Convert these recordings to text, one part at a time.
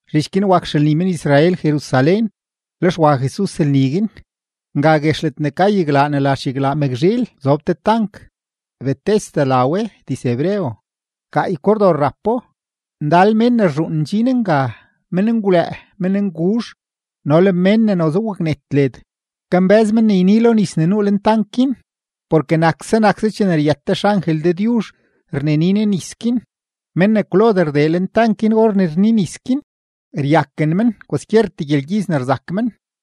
Zhich guin wak xelni men-Israel Jerusalén, lex wa Jesus lni guin. Nga guex ledne ka yaglaa ne la xyaglaa Mëkzhiil zob te tank, Betesda la we diz-hebreo; gaay kordor rapo. Ndal mén ne rzhuun ndxin nga, menngwlëë, mennguzh, no le mén ne noze waknet led, kambë́z men ne yni lo nis ne nuu lentank guin. Porke nakse nakse chene ryët te xangel Dëdyuzh rneni ne nis guin, mén ne kwlodee rdee lentank guin or ne rni nis guin, ryaken men kwaskyertee gyelgyiz ne rzak men.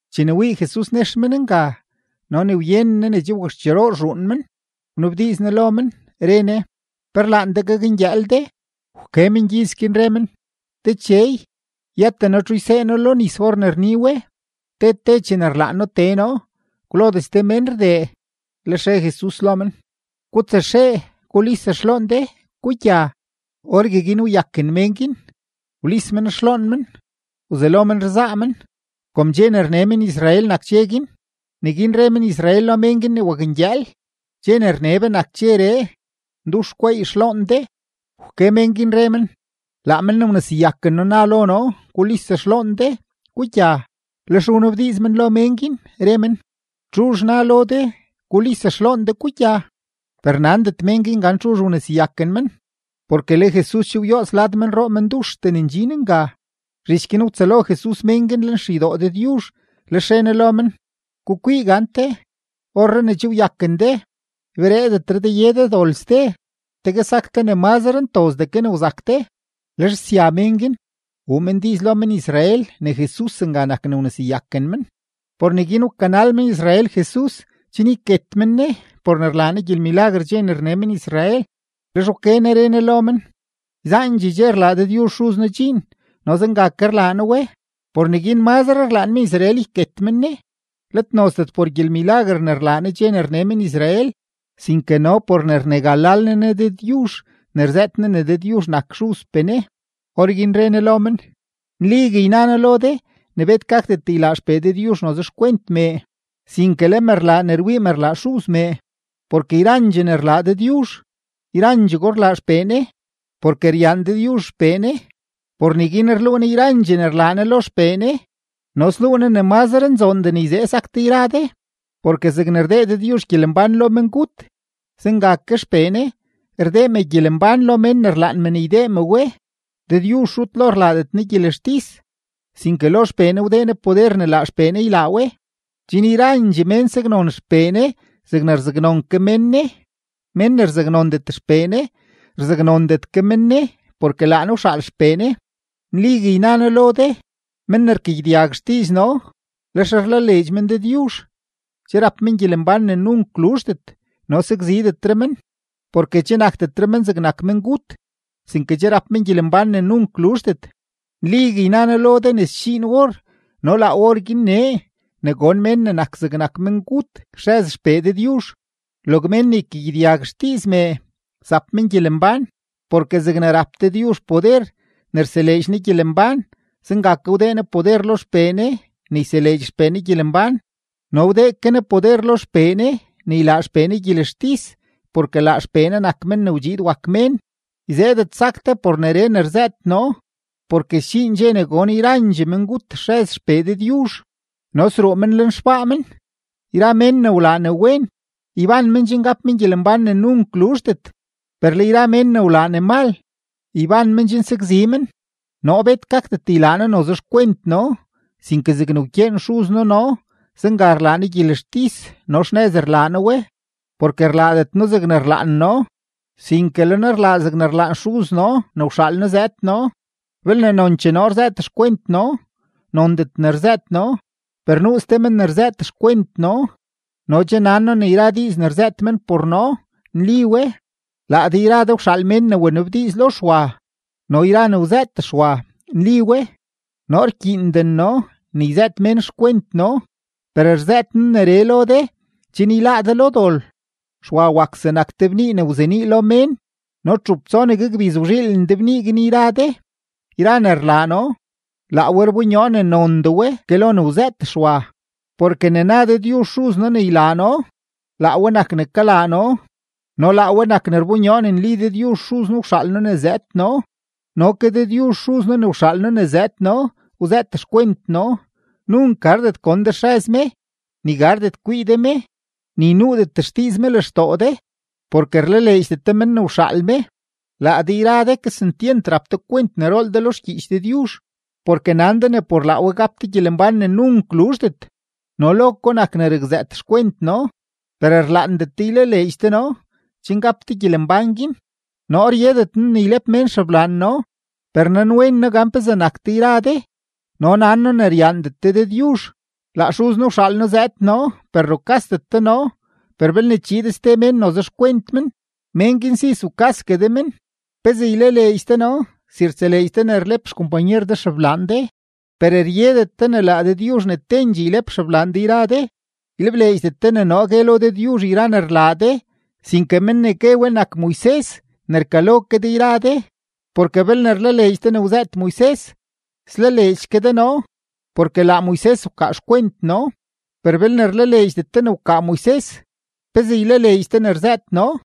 Chene wii Jesus nex men nga no ne wyenen Ne ne che wakxcheroo rzhuun men, wnabdiiz Ne lo men, re Ne: ―¿Pe rlaan de gakngyëël de? Wke mengyiz guin, re men: ―Dechey, yëten noo txu ysee noo lo nis or ne rni we. Te te chene rlaan noo tee noo, kwlodee ste mén rdee. Lex re Jesus lo men: ―Gutsaxee gulis xloon de, gugya. Orgueguin wyaken mén guin, wlis men xloon men, wzelo men rzaa men. Kom dxe ne rne men-Israel nak dxe guin, neguin re men-Israel lo mén guin ne wakngyëël: ―Dxe ne rne be nak nedxeree; ndux gweey de xloon de. Wke mén guin, re men: ―Laa men ne wneseyaken noo na lo noo: “Gulis xloon de, gugya.” Lex wnabdiiz men lo mén guin, re men: ―¿Txuzh na lo de: “Gulis xloon de, gugya”? Per nandet mén guin gan txuzh wneseyaken men, porke le Jesus che woots lad yra menroo menduxtee ne ndxin nga. Zhich guin wtsëlo Jesus mén guin lenxeydoo Dëdyuzh, lex re Ne lo men: ―Gukwii gante, orree ne che wyaken de, ybereedetre de ye de dol ste, tegue sak de ne mazre ntozdee ke ne wzak de. Lex sya mén guin, wuu men diiz lo men-Israel ne Jesus nga nak ne wneseyaken men. Por neguin wkanal men-Israel Jesus chen yket men Ne, por ne rlaa Ne gyelmilaguer dxe ne rne men-Israel. Lex wke Ne re Ne lo men: ―Yzaandxee dxe rlaa Dëdyuzh Xuz noo dxiin, no zenga ke rlaa noo we. Por neguin mazre rlaan men-Israel yket men Ne, let nozdet por gyelmilaguer ne rlaa Ne dxe ne rne men-Israel, sinke no por ne rnegalal Ne Ne Dëdyuzh ne rzëët Ne ne Dëdyuzh nak Xuzpee Ne. Orguin re Jesus lo men: ―Nligue yna noo lo de ne bet gakdet ylaa XPee Dëdyuzh noze xkwent mee, sinke le me rlaa ne rwii me rlaa Xuz mee. Porke yrandxee ne rlaa Dëdyuzh, yrandxego rlaa XPee Ne. Porke ryaan Dëdyuzh XPee Ne, por neguin rluu Ne yrandxee ne rlaa Ne lo XPee Ne, no sluu Ne ne mazre nzoondee ne yzee sak de yra de. Porke zegne rdee Dëdyuzh gyelembán lo mengut, zenga ke XPee Ne, rdee me gyelembán lo mén ne rlaan me ne ydee me we. Dëdyuzh rut lo rlaadet Ne gyelextis, sinke lo XPee Ne wdee Ne poder ne laa XPee Ne ylaa we, chen yrandxee mén saknon XPee Ne zegne rzaknon ke men Ne. Mén ne rzaknondet XPee Ne, rzaknondet ke men Ne porke laa Ne wxaal XPee Ne. ’Nligue yna noo lo de: Men ne rkagyedyag xdiiz noo, lex rlaleedx men Dëdyuzh, che rap men gyelembán ne nunk luzhdet no sakzidetre men. Porke che nakdetre men zegnak mengut, sinke che rap men gyelembán ne nunk luzhdet. Nligue yna noo lo de ne sdxiin or no laa orguin nee ne gon mén ne nak zegnak mengut xrëz XPee Dëdyuzh; log men ne ykagyedyag xdiiz mee, zap men gyelembán. Porke zegne rap Dëdyuzh poder ne rseleedx Ne gyelembán, zenga ke wdee Ne poder lo XPee Ne ne yseleedx XPee Ne gyelembán, no wdee ke Ne poder lo XPee Ne ne ylaa XPee Ne gyelextis porke laa XPee Ne nak Men ne wdxiid wak Mén. Yzeedet sak de por neree ne rzëët noo porke sdxiin dxe ne gon yrandxee mengut xrëz XPee Dëdyuzh no sruu men lenxbaa men. Yra mén ne wlaa ne wen, yban men chen gap men gyelembán ne nunk luzhdet; per le yra mén ne wlaa ne mal, yban men chen sakzi men. ’Noo bet gakdet ylaa noo noze xkwent noo, sinke zegne rkyeen Xuz noo noo, zenga rlaa noo gyelextis no xnëz rlaa noo we, porke rlaadet noo zegne rlaan noo, sinke le noo rlaa zegne rlaan Xuz noo ne wxaal noo zëëd noo. Belne nonchee noo rzëët xkwent noo, nondet ne rzëët noo. Per nuu ste men ne rzëët xkwent noo, no che nan noo ne yra diiz ne rzëët men por noo, nli we. Laa de yra de wxaal mén ne wa wnabdiiz lo Xwa, no yra ne wzëët Xwa nli we. Noo rkyiinden noo ne yzëët mén xkwent noo, per rzëët noo neree lo de chen yláá de lo dol. Xwa wak zegnak te bnii ne wzenii lo mén, no txup tsonegue gbiz wzhiilen de bnii guin yra de. Yra ne rlaa noo, laa we rbonyoo ne nondee we ke lo ne wzëët Xwa. Porke ne na Dëdyuzh Xuz noo ne ylaa noo, laa we nak ne kalaa noo no laa we nak ne rbonyoo ne nli Dëdyuzh Xuz noo wxaal noo zëëd noo. No ke Dëdyuzh Xuz noo ne wxaal noo zëëd noo wzëët xkwent noo. Nunk gardet gon de xrëz me, ni gardet kwii de me, ni nuudet xdiiz me lextoo de, porke rlaleedxdet de men ne wxaal me. Laa de yra de kesentyent rap de kwent ne rool de lo xgyiich Dëdyuzh, porke nan de ne por laa we gap de gyelembán ne nunk luzhdet, no lo ko nak ne rakzëët xkwent noo. Per rlaandet de ylaleedx de noo chen gap de gyelembán guin. ’Noo ryedet noo ne ylep mén xeblaan noo. Per nanwen noo gan pezee nak de yra de no nan noo ne ryaandet de Dëdyuzh. Laa Xuz noo wxaal noo zëëd noo, per rukasdet de noo, per belne chiid ste mén noze xkwent men, mén guin si zukasgue de men. ¿Pezee ylaleedx de noo, si rtseleedx de ne rlep xkompanyer de xeblaan de, per ryedet de ne laa Dëdyuzh ne tendxee ylep xeblaan de yra de? Ylebleedxdet de ne noo gue lo Dëdyuzh yra ne rlaa de, sinke men ne gue we nak Moises, ne rkalo ke de yra de. Porke belne rlaleedx de ne wzëët Moises, slaleedx ke de noo, porke laa Moises wkaa xkwent noo. Per belne rlaleedxdet de ne wkaa Moises, ¿pezee ylaleedx de ne rzëët noo?